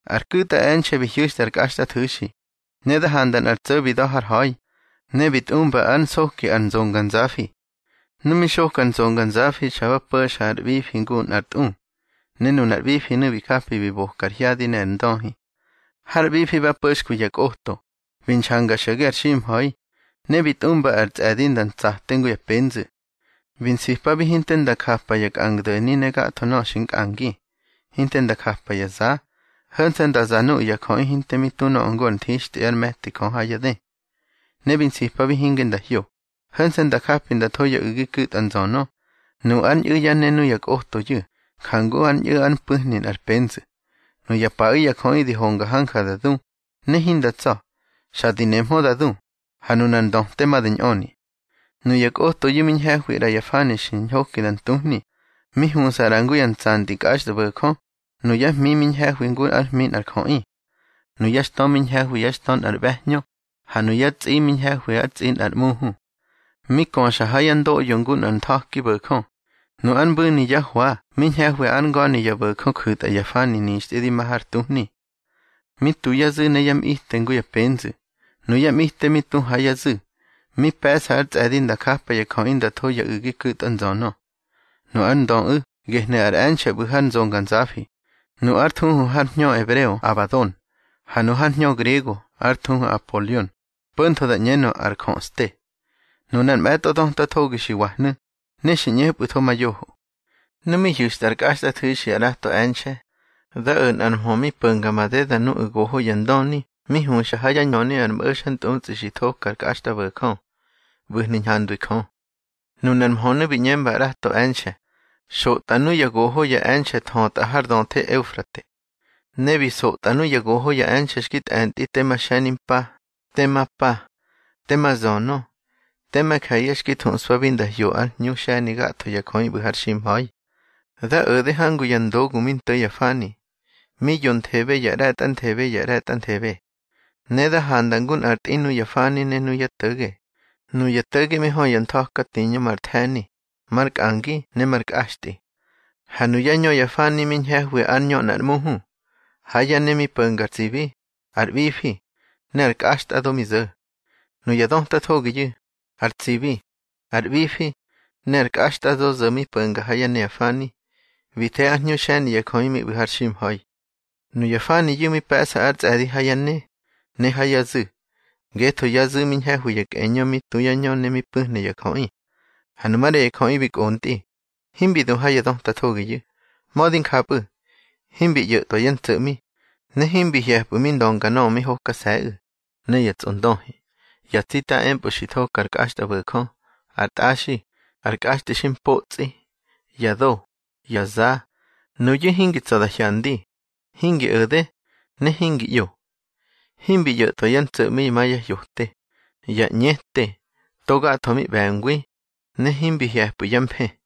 Ar ku̱tꞌa e̱nxe̱ bi hyu̱xtꞌa ár kꞌaxtꞌathu̱xi, ne da handa nꞌar tso̱ bi da̱ har ha̱i, ne bi tꞌumba ár nsoki ar nzonganzafi. Nu mi xoka ar nzonganzafi xa ba po̱xa ar ꞌbifi ngu nꞌar tꞌu, ne nunar ꞌbifinu̱ bi japi bi boka ar hyadi ne ar ndöhi. Har ꞌbifi ba po̱xkwi ya kꞌoto, bi nxanga xo̱ge har ximha̱i, ne bi tꞌumba ar tsꞌe̱di nda ntsate ngu ya penzu̱. Bi nsipabi hinte nda japa ya kꞌangdo̱ni ne gatho nöꞌö xi nkꞌangi, hinte nda japa ya za. Ho̱nse̱ nda za nuya jöꞌi hinte mi tu nöꞌö ngu ar nthixtꞌi ár me̱ti Jö ha yá dë. Ne bi nsipabi hinge nda hyo, ho̱nse̱ nda japi nda tho ya u̱gi ku̱tꞌa nzönö. Nu ár ñꞌu̱ yá ne nuya kꞌotoyu̱, jangu ár ñꞌu̱ ár mpu̱hni nꞌar penzu̱. Nuya paꞌu̱ ya jöꞌi di honga hanja da du, ne hinda tsa̱. Xa di nemhö da du, ha nunar ndöte ma da ñꞌöni. Nuya kꞌotoyu̱ mi ñhe̱hwi ꞌra ya fani xi ñhoki da ntuhni. Mi huꞌsa ꞌra ngu ya ntsantꞌi kꞌaxtꞌabo̱jö. Nuyá hmi mi ñhe̱hwi ngu ár hmi nꞌar jöꞌi. Nuyá xtö mi ñhe̱hwi yá xtö nꞌar ꞌbe̱hñö, ha nuyá tsꞌi mi ñhe̱hwi yá tsꞌi nꞌar ꞌmuhu. Mi köxa ha yá ndoꞌyo ngu nꞌar ntha̱ki bo̱jö. Nu ár mbu̱ni yá hwa mi ñhe̱hwi ár nga̱ni ya bo̱jö ju̱tꞌa ya fani nixtꞌi di ma har tuhni. Mi tu yá zu̱ ne yá mꞌite ngu ya penzu̱. Nuyá mꞌite mi tu ha yá zu̱, mi pe̱ꞌsa ar tsꞌe̱di nda japa ya jöꞌi nda tho ya u̱gi ku̱tꞌa nzönö. Nu ár ndöꞌu̱, gehnu̱ ar e̱nxe̱ ꞌbu̱ har nzonganzafi. Nu ár thuhu har hñö ebreo Abadon, ha nu har hñö griego ár thuhu ar Apolion (po̱ntho da ꞌñenö, ar jöꞌste). Nunar mꞌe̱tꞌo döta thogi xi wahnu̱, ne xi ꞌñepꞌu̱tho ma yoho. Nu mi hyu̱xtꞌa ár kꞌaxtꞌathu̱xi ar ꞌrato e̱nxe̱, da o̱ nꞌar mhö mi po̱nga madeda nuꞌu̱ goho ya ndöni mi huxa ha yá ñöni ar mꞌo̱xantꞌutsꞌi xi thoka ar kꞌaxtꞌabo̱jö, ꞌbu̱hnu̱ ñhandwi Jö. Nunar mhönu̱ bi ꞌñemba ar ꞌrato e̱nxe̱: —Xotꞌa nuya goho ya e̱nxe̱ thötꞌa har döthe Eufrate. Ne bi nsotꞌa nuya goho ya e̱nxe̱ xki tꞌe̱ntꞌi tema xe̱nimpa, tema pa, tema zönö, tema je̱ye̱ xki thuꞌspabi nda hyo nꞌár hñu xe̱ni gatho ya jöꞌi ꞌbu̱ har ximha̱i. Da o̱de hangu ya ndogu mi nto̱ ya fani, mi yonthebe ya ꞌre̱tꞌanthebe ya ꞌre̱tꞌanthebe. Ne da handa ngu nꞌar tꞌi nuya fani ne yá to̱ge. Nuya to̱ge mi hö ya ntha̱ka tiñö mar the̱ni, mar nkꞌangi ne mar nkꞌaxtꞌi. Ha nuyá ñö ya fani mi ñhe̱hwi ár ñö nꞌar ꞌmuhu. Ha yá ne mi po̱nga ar tsibi, ar ꞌbifi, ne ar kꞌaxtꞌado mi zo̱. Nuya döta thogiyu̱, ar tsibi, ar ꞌbifi, ne ar kꞌaxtꞌado zo̱ mi po̱nga ha yá ne ya fani, bi the ár hñu xe̱ni ya jöꞌi mi ꞌbu̱ har ximha̱i. Nuya faniyu̱ mi pe̱ꞌsa ár tsꞌe̱di ha yá ne, ne ha yá zu̱, ngetho yá zu̱ mi hñe̱hwi ya kꞌeñö mi tu yá ñö ne mi pu̱hna ya jöꞌi. Ha nu maꞌra ya jöꞌi bi kꞌontꞌi, himbi du ha ya döta thogiyu̱. Mödi njapꞌu̱, himbi ꞌyo̱tꞌwa yá ntso̱ꞌmi. Ne himbi hye̱pꞌu̱ mi ndönga nöꞌö mi hokase̱ꞌu̱, ne ya tsꞌondöhi, ya tsita empꞌö xi thoka ar kꞌaxtꞌabo̱jö, ar tꞌaxi, ar kꞌaxtꞌi xi mpotsꞌi, ya do, ya za. Nuyu̱ hingi tsa̱ da hyandi, hingi o̱de, ne hingi ꞌyo. Himbi ꞌyo̱tꞌwa yá ntso̱ꞌmi ma ya hyote, ya ꞌñete, togatho mi ꞌbe̱ngwi, ne himbi hye̱pꞌu̱ yá mfë.